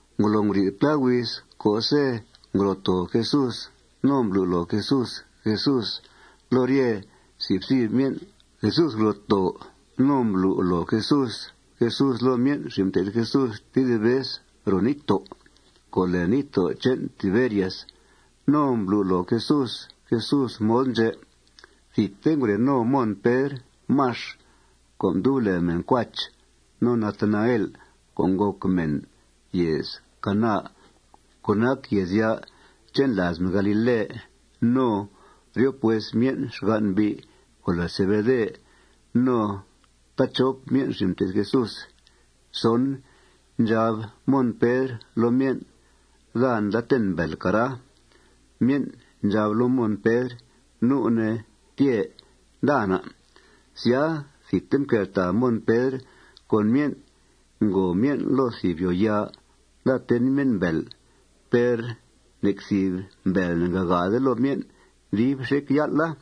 Ngolo nguri'th plá huiz co'se' ngro' too Jesús no mblu' loo Jesús Jesús loo rye si' fthib myen', Jesús ngro' too no mblu' loo Jesús Jesús loo myen' xin' mté'th Jesús tedib vez ro níttó' co' lèe níttó' che'n Tiberias. No mblu' loo Jesús Jesús mod ndxè'. Thidte ngure no Mon Pedr Max co' mdub lèe mèn Cuach, no Natanael co' ngòc mèn yèez Caná co' nac yèezya' che'n làaz mèn galile, no ryop hues myen' xgan' mbi' co' lèe Zebede, no taachop myen' xin' mté'th Jesús. Ndxab Mon Pedr loo myen': ―Daa nda ten mbèel, cara. Myen' ndxab loo Mon Pedr: ―Nu' ne tyee. Nda na'. Sya, thidte mqueltàa Mon Pedr con myen'. Ngòo myen' loo thìb yòoyaa. Nda ten myen' mbèel. Per nec thìb mbèel ne'ngagaade loo myen' dib xec yál'a.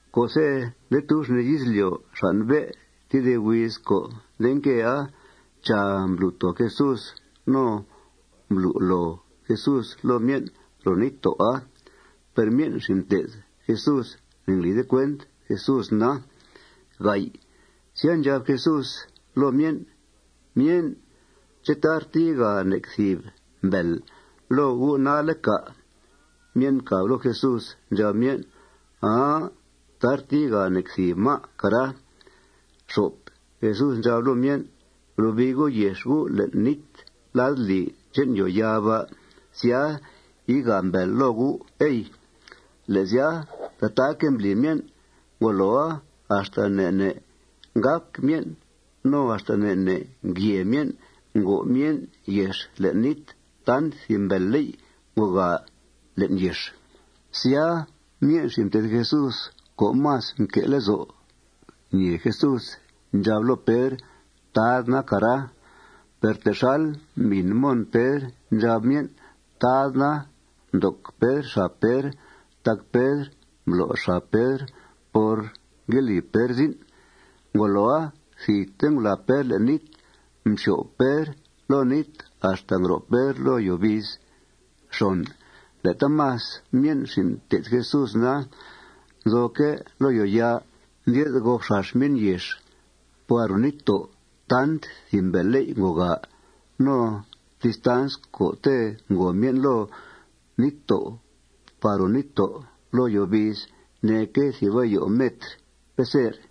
Co'se' nde tub xnìi izlyo' xàn' bé' tedib huiz co' nde nquea, chàa, mblu' too Jesús no mblu' loo Jesús loo myen' ro níttó'a. Per myen' xin' mté'th Jesús ne'nglide cuent Jesús na. Sya, ndxab Jesús loo myen': ―Myen', ¿ché' tarte yigaa nec thìb mbèel loo gu' nalle', cà'? Myen' mcàb loo Jesús. Ndxab myen': ―Aa. Tarte yigaa nec thìb má', cara. Jesús ndxab loo myen': ―Blobii gu' yex gu' le'n nít ladlì che'n yòoyaa ba'. Sya, yigaa mbèel loo gu', ey. Le' sya, tataaque' mbli myen'. Ngoloa, axta ne' ne' ngác myen' no axta ne' ne' ngyèe myen' ngo' myen' yex le'n nít tant thìb mbèelléy' ngogaa le'n yex. Sya, myen' xin' mté'th Jesús co' más mque' lezo' ñèe Jesús ndxab loo Pedr: ―Tad na, cara. Per texal mbìn Mon Pedr ndxab myen': Tad na, mdoc Pedr xab Pedr tac Pedr mblo' xab Pedr por ngue li Pedr zin'. Ngoloa, thidte ngulàa Pedr le'n nít. Mxyo'f Pedr loo nít axta ngro' Pedr loo yòo biiz. Le' taamas myen' xin' mté'th Jesús na, nzoque' loo yòoyaa. Ndye'th gop xax myen' yex par ro níttó' tant thìb mbèelléy' ngogaa. No distans co'te' ngo myen' loo níttó' par ro nít loo yòo biiz neeque' thìb ayo metr peser.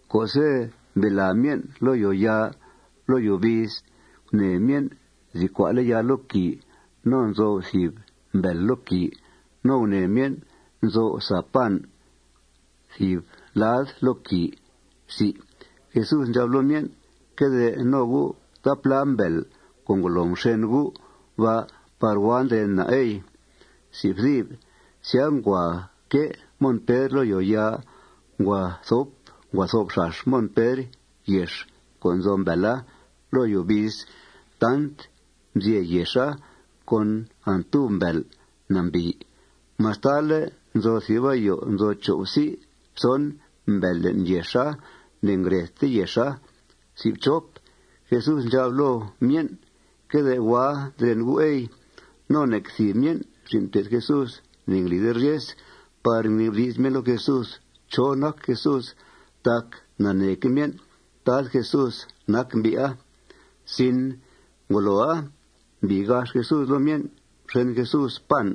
Co'se' mbilàa myen' loo yòoyaa loo yòo biiz, gunèe myen' nzi cua'le' yaa loo quìi. No nzo'f thìb mbèel loo quìi. No gunèe myen' nzo'f sa pan thìb lad loo quìi. Jesús ndxab loo myen': ―Que de no gu' taaplá mbèel co' ngolo mxen gu' ba' par hua ndren na', ey. Sya, ngua quée Mon Pedr loo yòoyaa. Ngua thop xax Mon Pedr yex co' nzo mbèela loo yòo biiz tant mzyè yexa con antub mbèel nambìi. Mastale' nzo thìb ayo nzo cho' psi' pson mbèel le'n yexa, ne'ngredte yexa. Jesús ndxab loo myen': ―Que de hua ndren gu', ey. No nec thìb myen' xin' mté'th Jesús ne'nglide ryes par ngnibdi's myen' loo Jesús chó nac Jesús tac naneeque' myen' Tad Jesús nac mbi'a. Ngoloa, mbii gax Jesús loo myen'. Mxen Jesús pan.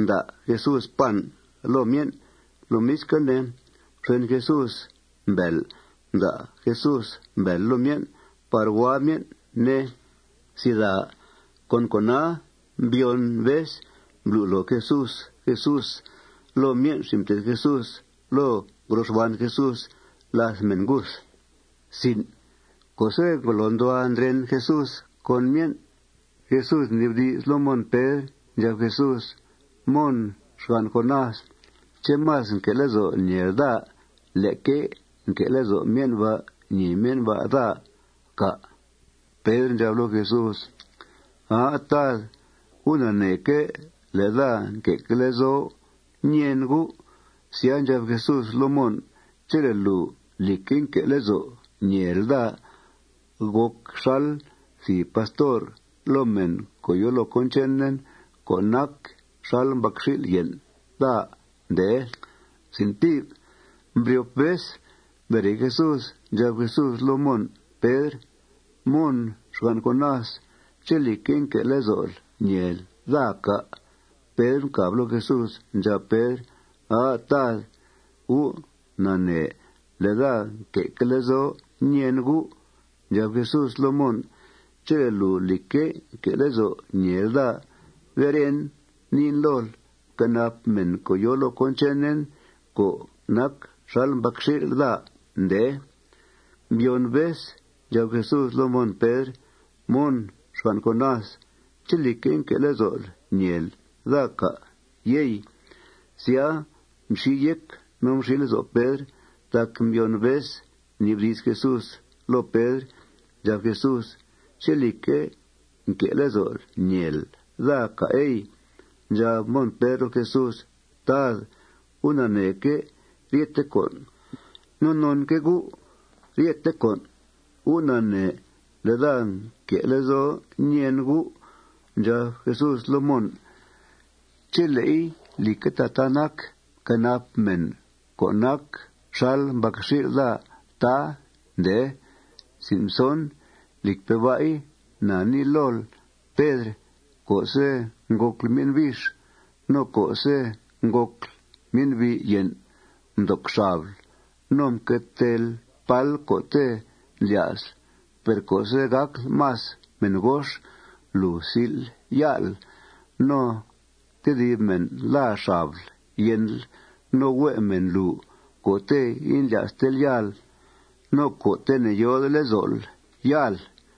Mda' Jesús pan loo myen'. Lomisque' ne, mxen Jesús mbèel. Mda' Jesús mbèel loo myen' par hua myen', ne. Con cona, mbyon vez mblu' loo Jesús Jesús loo myen' xin' mté'th Jesús loo ngro xban Jesús làth mèn nguth. Co'se' ngolo nduhua ndren Jesús con myen', Jesús mnibdi's loo Mon Pedr. Ndxab Jesús: ―Mon, xgan' Jonás, ¿ché' más nque' lezo'l ñèel daa leque nque' lezo' myen' ba' ñèe myen' daa, cà'? Pedr ndxab loo Jesús: ―Aa, Tad, U' naneeque' le' daa nque'que' lezo' ñèen U'. Sya, ndxab Jesús loo Mon: ―Chele' lùu, lìcque', nque' lezo' ñèel daa, gòc xal thìb pastor loo mèn co' yòo loo cón chenen co' nac xal mbacxil' yen' daa, ndee. Mbryop vez mbere Jesús, ndxab Jesús loo Mon Pedr: ―Mon, xgan' Jonás, ¿ché', lìcque', nque' lezo'l ñèel daa, cà? Pedr mcàb loo Jesús. Ndxab Pedr: ―Aa, Tad, U' nanee le' daa nque' lezo' ñèen U'. Ndxab Jesús loo Mon: ―Chele' lùu, lìcque', nque' lezo' ñèel daa, beren niin lool: Fquenap mèn co' yòo loo cón chenen co' nac xal mbacxil' daa, ndee. Mbyon vez ndxab Jesús loo Mon Pedr: ―Mon, xgan' Jonás, ¿ché', lìcque', nque' lezo'l ñèel daa, cà', yey? Sya, mxi yéc no mxi lezo' Pedr tac mbyon vez mnibdi's Jesús loo Pedr. Ndxab Jesús: ―¿Ché', lìcque', nque' lezo'l ñèel daa, cà', ey? Ndxab Mon Pedr loo Jesús: ―Tad, U' naneeque' ryethe con'. No nonque' U' ryethe con'. U' nanee le' daa nque' lezo' ñèen U'. Ndxab Jesús loo Mon: ―Chele'i, lìcque' tataa nac, fquenap mèn co' nac xal mbacxil' daa, tá, ndee. Lìcpe' ba'i, na nii lool, Pedr, co'se' ngòcl myen' bix no co'se' ngòcl myen'bi' yen', mdoc xabl no mque teel pál co'te' mblya'sl. Per co'se' gàcl más mèn gox, lùu sil ya'l. No tedib mèn làa xabl yenl. No hue' mèna lùu co'te' indlya'stel yal no co'te' ne'yòode lezo'l yal.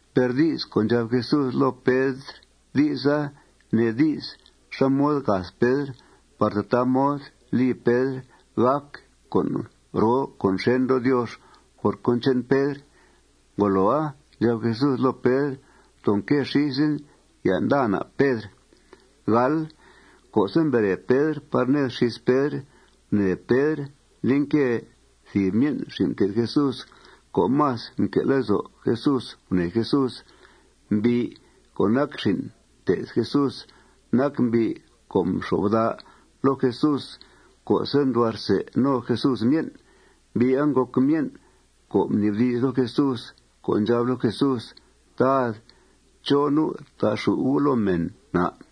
Per di's co' ndxab Jesús loo Pedr, di'sa nee di's xá mod gath Pedr par tataa mod li Pedr gàc con' roo con' xèn loo Diox por cón che'n Pedr. Ngoloa, ndxab Jesús loo Pedr: ―Ftoo nque xísen. Ya' nda na', Pedr. Co'se' mbere Pedr par ned xís Pedr, gunèe Pedr nde nque thìb myen' xin' mté'th Jesús co' más mque' lezo' Jesús gunèe Jesús. Mbi' co' nac xin' mté'th Jesús nac mbi' co' mxo'f bda' loo Jesús co'se' nduhua rsè no Jesús myen'. Mbi'a ngòc myen' co' mnibdi's loo Jesús co' ndxab loo Jesús: ―Tad, ¿chó nu' ta'xù' U' loo mèn, à'?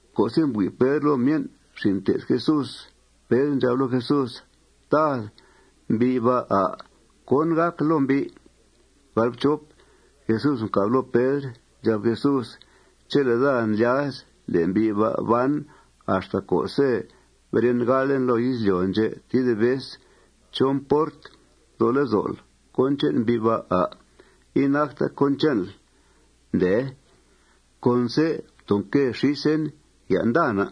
Co'se' mbui' Pedr loo myen' xin' mté'th Jesús, Pedr ndxab loo Jesús: ―Tad, ¿mbi' ba', à'? ¿Cón gàc loo mbi'? Jesús mcàb loo Pedr. Ndxab Jesús: ―Chele' daa ndlyaz le' mbi' ba' ban axta co'se' beren galen loo izlyo' ndxè' tedib vez, ¿chó mport nzo lezo'l cón che'n mbi' ba', à'? Inacta cón che'nl, ndee. Conse' ftoo nque xísen. Ya' nda na'.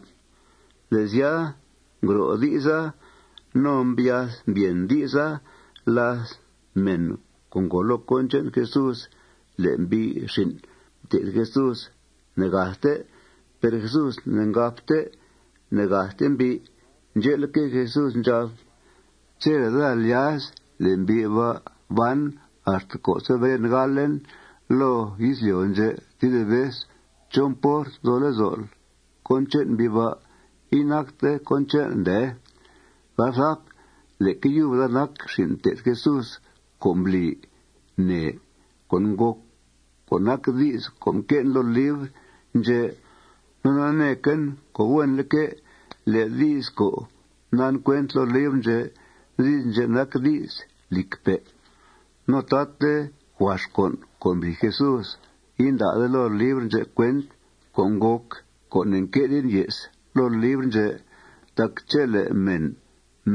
Le' sya, ngro' di'sa no mbyath mbyèn di'sa làth mèn co' ngòo loo cón che'n Jesús le' mbi' xin' mté'th Jesús ne'gathte. Per Jesús ne'ngabte: Ne'gathte mbi'. Ndxe'leque', Jesús ndxab: Chele' daa lyaz le' mbi' ba' ban axta co'se' beren galen loo izlyo' ndxè' tedib vez, ¿chó mport nzo lezo'l cón che'n mbi' ba'? Inacta cón che'nl, ndee. Leque yub daa nac xin' mté'th Jesús co' mbli nèe con' ngòc co' nac di's co' mque'en loo libr ndxè'. No naneequen co' huenleque' le' di's co' mdan cuent loo libr ndxè', di's ndxè' nac di's lìcpe'. No taate huax con' co' mbli Jesús inda'de loo libr ndxè' cuent co' ngòc co' ne'nque'den ye's loo libr ndxè'. Tac chele' mèn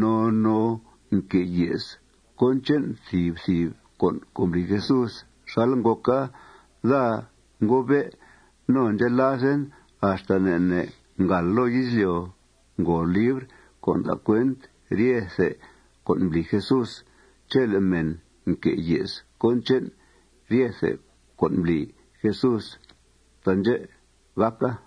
noo noo nque' ye's cón che'n thìb thìb con' co' mbli Jesús xal ngòca, daa ngobe' no ndxelazen axta ne' ne' ngàal loo izlyo' ngòo libr co' nda' cuent ryethe con' mbli Jesús chele' mèn nque' ye's cón che'n ryethe con' mbli Jesús. Taandxè' gàca.